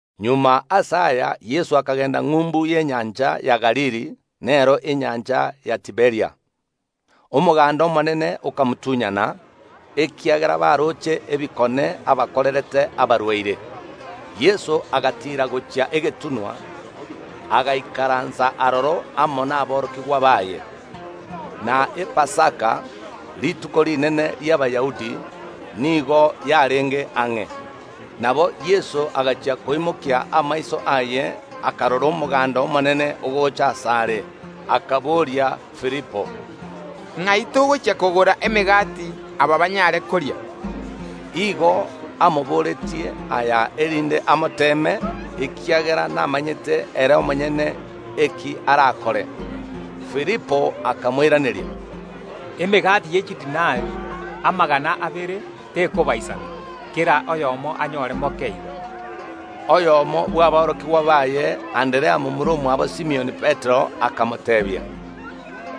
Magega ase aya Yeso akagenda ng’umbu y’enyancha ya Galili, nero enyancha ya Tiberia. Omoganda omonene okamotunyana, ekiagera baroche ebikone abakorerete abarwaire. Yeso agatiira gochia egetunwa, agaikaransa aroro amo naborokigwa baye. Na Epasaka, rituko rinene ri’Abayahudi, nigo yarenge ang’e. Nabo Yeso agachia koimokia amaiso aye, akarora omoganda omonene ogocha asare, akaboria Filipo, “Ng’ai togochia kogora emegati, aba banyare koria?” Igo amoboretie aya, erinde amoteeme, ekiagera namanyete ere omonyene eki arakore. Filipo akamoiraneria, “Emegati ye chidinari amagana abere tekobaisana, kera oyomo anyore moke igo.” Oyomo bw’aborokigwa baye, Anderea, momura omwabo Simioni Petero, akamoteebia,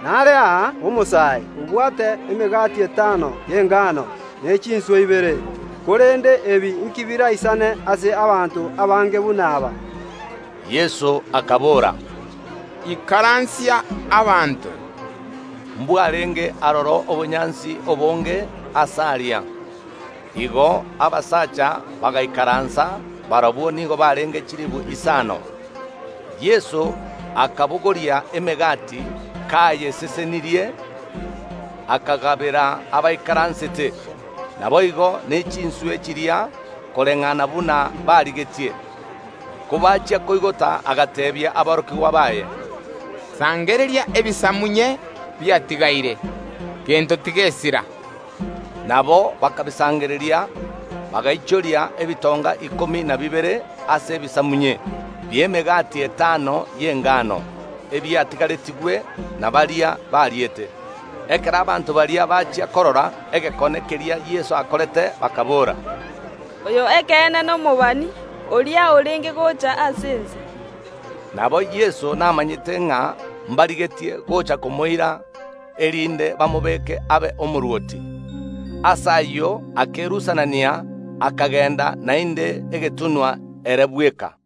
“Nare aa omosae, obwate emegati etano y’esairi ne chinswe ibere, korende ebi inki biraisane ase abanto abange buna aba?” Yeso akabora, “Ikaransia abanto.” Mbwarenge aroro obonyansi obonge aase aria. Igo abasacha bagaikaransa, barabwo nigo barenge chilifu isaano. Yeso akabogoria emegati; kayesesenirie, akagabera abaikaransete; naboigo ne chinswe chiria, koreng’ana buna barigetie. Kobachia koigota, agateebia aborokigwa baye, “Sangereria ebisamunye biatigaire, gento tigesira.” Nabo bakabisangereria, bagaichoria ebitonga ikomi na bibere ase ebisamunye bi’emegati etano y’esairi, ebiatigaretigwe na baria bariete. Ekero abanto baria bachia korora egekone keria Yeso akorete, bakaboora, “Oyo ekeene nomobani oria orenge gocha ase ense!” Nabo Yeso namanyete ng’a mbarigetie gocha komoira, erinde bamobeeke abe omorwoti. Ase ayio akerusanania, akagenda naende egetunwa ere bweka.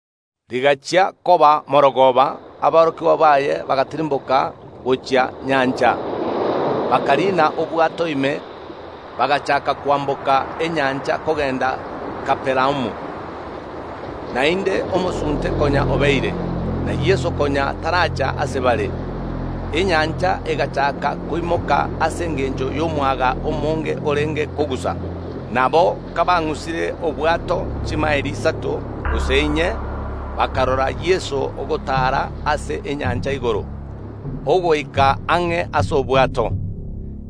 Rigachia koba mogoroba, aborokigwa baye bagatirimboka gochia nyancha, bakariina obwato ime, bagachaaka kwamboka enyancha kogenda Kapernaumu. Naende omosunte konya obeire, na Yeso konya taracha ase bare. Enyancha egachaaka koimoka ase engencho y’omwaga omonge orenge kogusa. Nabo kabang’usire obwato chimaeli isato gose inye bakarora Yeso ogotaara ase enyancha igoro, ogoika ang’e ase obwato.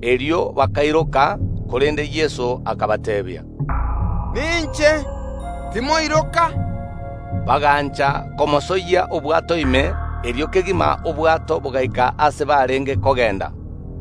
Erio bakairoka, korende Yeso akabateebia, “Ninche. Timoiroka!” Bagancha komosoyia obwato ime, erio kegima obwato bogaika ase barenge kogenda.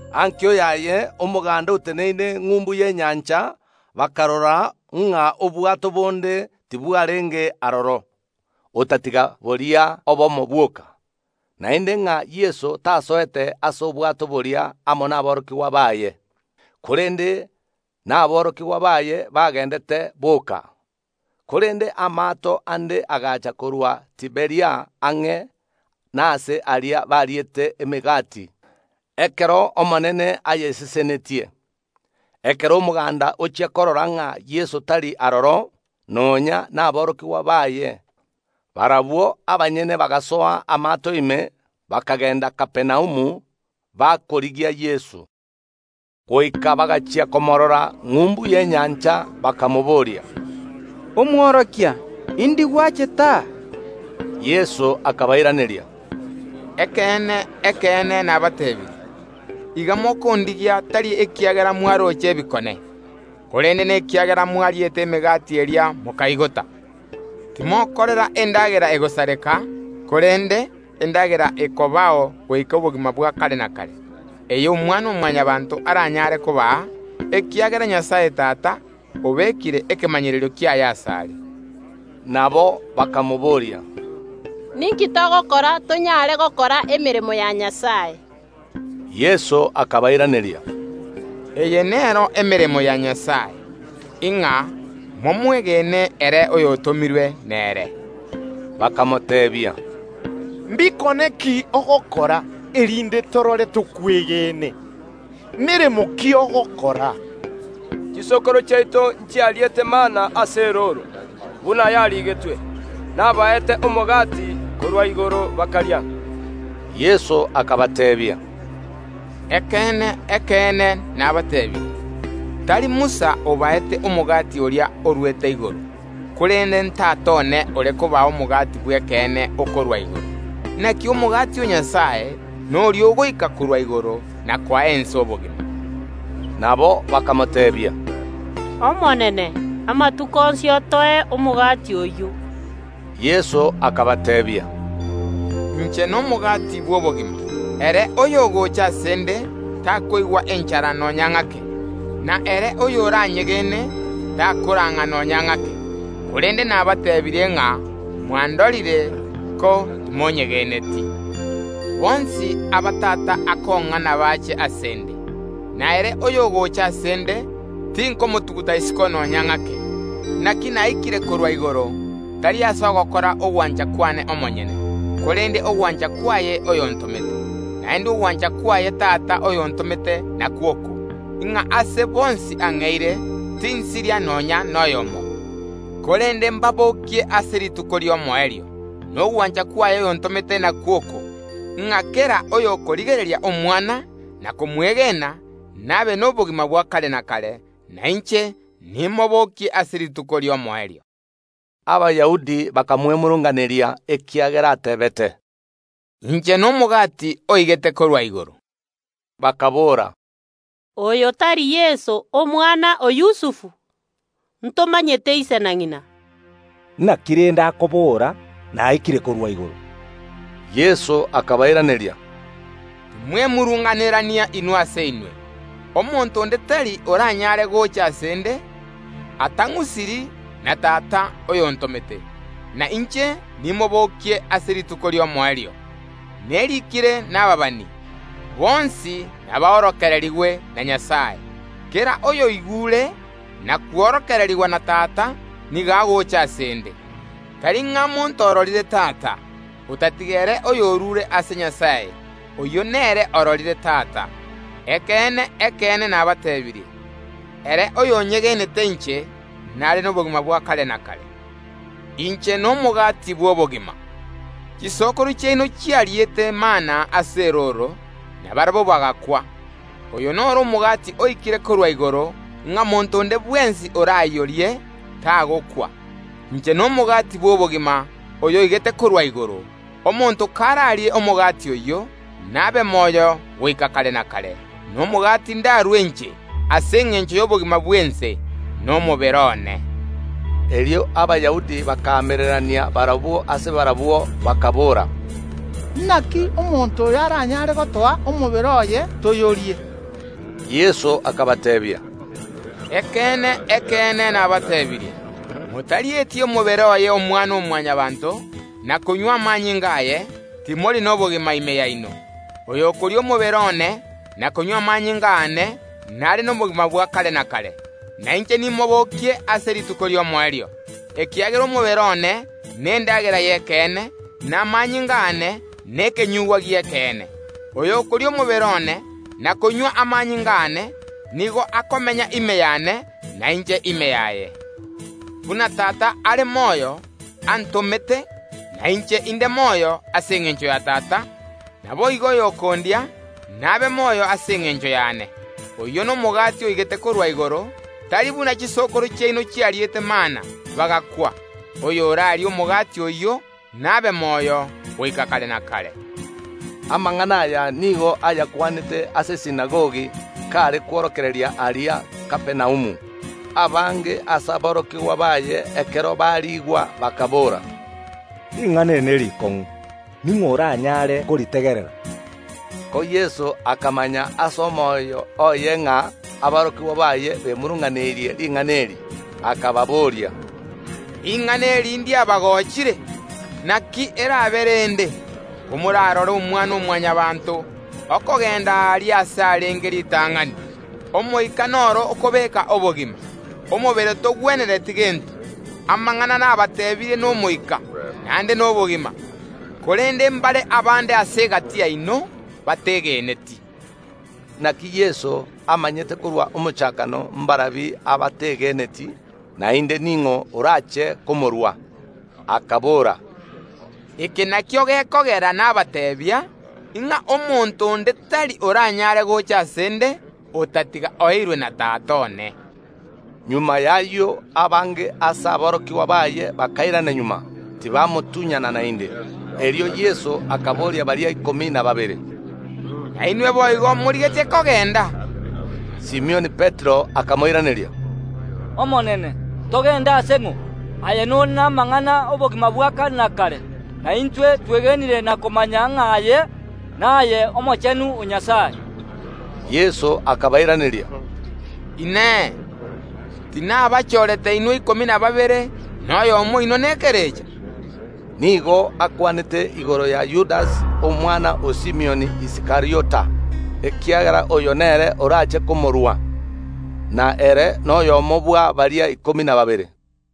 Ankio yaye omoganda oteneine ng’umbu y’enyancha bakarora ng’a obwato bonde tibwarenge aroro, otatiga boria obomo bwoka, naende ng’a Yeso tasoete ase obwato boria amo naborokigwa baye, korende naborokigwa baye bagendete boka. Korende amaato ande agacha korwa Tiberia ang’e nase aria bariete emegati ekero Omonene ayesesenetie. Ekero omoganda ochia korora ng’a Yeso tari aroro, nonya naborokigwa baye, barabwo abanyene bagasoa amaato ime, bakagenda Kapernaumu, bakorigia Yeso. Goika bagachia komoorora ng’umbu y’enyancha bakamobooria, “Omworokia, indi gwachete aa?” Yeso akabairaneria, “Ekeene, ekeene, nabateebirie: Iga mokondigia, tari ekiagera mwaroche ebikone, korende nekiagera mwariete emegati eria, mokaigota. Timokorera endagera egosareka korende, endagera ekobao goika obogima bwa kare na kare, eye Omwana‐o‐Mwanyabaanto aranyare kobaa, ekiagera Nyasae Tata obekire ekemanyererio kiaye asare.” Nabo bakamobooria, “Ninki togokora tonyare gokora emeremo ya Nyasae?” Yeso akabairaneria, “Eye nero emeremo ya Nyasae, ng’a momwegene ere oyotomirwe nere.” Bakamoteebia, “Mbikone ki ogokora, erinde torore tokwegene? Meremo ki ogokora? Chisokoro chiaito nchiariete mana ase erooro, buna yarigetwe: Nabaete omogati korwa igoro bakaria.” Yeso akabateebia, “Ekeene, ekeene, nabateebirie: Tari Musa obaete omogati oria orwete igoro, korende n’Tata one ore kobaa omogati bw’ekeene okorwa igoro. Naki omogati o Nyasae noria ogoika korwa igoro na koa ense obogima.” Nabo bakamoteebia, “Omonene, amatuko onsi otoe omogati oyio.” Yeso akabateebia, “Inche nomogati bw’obogima; ere oyogocha ase ’nde takoigwa enchara nonya ng’ake, na ere oyoranyegene takorang’a nonya ng’ake. Korende nabateebirie ng’a mwandorire, ko timonyegeneti. Bonsi aba Tata akong’a nabache ase ’nde, na ere oyogocha ase ’nde tinkomotuguta isiko nonya ng’ake. Naki naikire korwa igoro, tari ase ogokora ogwancha kwane omonyene, korende ogwancha kwaye oyontomete. Naende ogwancha kwaye Tata oyontomete nakwo oko, ng’a ase bonsi ang’eire tinsiria nonya noyomo, korende mbabokie ase rituko ri’omoerio. Nogwancha kwaye oyontomete nakwo oko, ng’a kera oyokorigereria Omwana na komwegena, nabe nobogima bwa kare na kare, na inche nimobokie ase rituko ri’omoerio.” Abayahudi bakamwemurunganeria, ekiagera ateebete, “Inche nomogati oigete korwa igoro.” Bakaboora, “Oyo tari Yeso, omwana o Yusufu? Ntomanyete ise na ng’ina. Naki rende akobora: Naikire korwa igoro?” Yeso akabairaneria, “Timwemurunganerania inwe ase inwe. Omonto onde tari oranyare gocha ase ’nde, atang’usiri na Tata oyontomete, na inche nimobokie ase rituko ri’omoerio. Nerikire nababani: Bonsi naborokererigwe na Nyasae. Kera oyoigure na kworokererigwa na Tata, nigo agocha ase ’nde. Tari ng’a monto ororire Tata, otatiga ere oyorure ase Nyasae, oyio nere ororire Tata. Ekeene, ekeene, nabateebirie: Ere oyonyegenete inche nare nobogima bwa kare na kare. Inche nomogati bw’obogima. Chisokoro chiaino nchiariete mana ase erooro, na barabwo bagakwa. Oyo noro omogati oikire korwa igoro ng’a monto onde bwensi orayorie, tagokwa. Inche nomogati bw’obogima oyoigete korwa igoro; omonto kararie omogati oyio, nabe moyo goika kare na kare; na omogati ndarue inche, ase engencho y’obogima bw’ense, nomobere one.” Erio Abayahudi bakaamererania barabwo ase barabwo, bakaboora, “Naki omonto oyo aranyare gotoa omobere oye toyorie?” Yeso akabateebia, “Ekeene, ekeene nabateebirie: Motarieti omobere oye Omwana‐o‐Mwanyabaanto na konywa amanyinga aye, timori nobogima ime yaino. Oyokoria omobere one na konywa amanyinga aane nare nobogima bwa kare na kare, na inche nimobokie ase rituko ri’omoerio, ekiagera omobere one nendagera y’ekeene, na amanyinga aane nekenyugwa gi’ekeene. Oyokoria omobere one na konywa amanyinga aane nigo akomenya ime yane, na inche ime yaye. Buna Tata are moyo antomete, na inche inde moyo ase engencho ya Tata, naboigo oyokondia, nabe moyo ase engencho yane. Oyio nomogati oigete korwa igoro, tari buna chisokoro chiaino chiariete mana, bagakwa; oyorarie omogati oyio nabe moyo goika kare na kare.” Amang’ana aya nigo ayakwanete ase esinagogi, kaare kworokereria aria Kapernaumu. Abange ase aborokigwa baye ekero bariigwa, bakaboora, “Ring’ana eri nerikong’u, ning’o oranyare koritegerera?” Ko Yeso akamanya ase omoyo oye ng’a aborokigwa baye bemurunganeirie ring’ana eri, akababoria, “Ring’ana eri ndiabagochire? Naki erabe rende, komorarore Omwana‐o‐Mwanyabaanto okogenda aaria aase arenge ritang’ani? Omoika noro okobeeka obogima, omobere togwenereti gento; amang’ana nabateebirie n’Omoika, naende nobogima. Korende mbare abande ase egati yaino bategeneti.” Naki Yeso amanyete korwa omochakano mbarabi abategeneti, naende ning’o orache komorua. Akabora, “Eke nakio gekogera nabateebia, ng’a omonto onde tari oranyare gocha ase ’nde, otatiga oeirwe na Tata one.” Magega y’ayio abange ase aborokigwa baye bakairana magega, tibamotunyana naende. Erio Yeso akaboria baria ikomi na babere, “Nainwe boigo morigetie kogenda?” Simioni Petero akamoiraneria, “Omonene! Togende ase ng’o? Aye nore namang’ana y’obogima bwa kare na kare. Na intwe twegenire na komanya ng’a aye naye Omochenu o Nyasae.” Yeso akabairaneria, “Inee! Tinabachorete inwe ikomi na babere, na oyomo oino Saitani?” Nigo akwanete igoro ya Yudasi, omwana o Simioni Iskariota, ekiagera oyo nere orache komorua; na ere noyomo bwa baria ikomi na babere.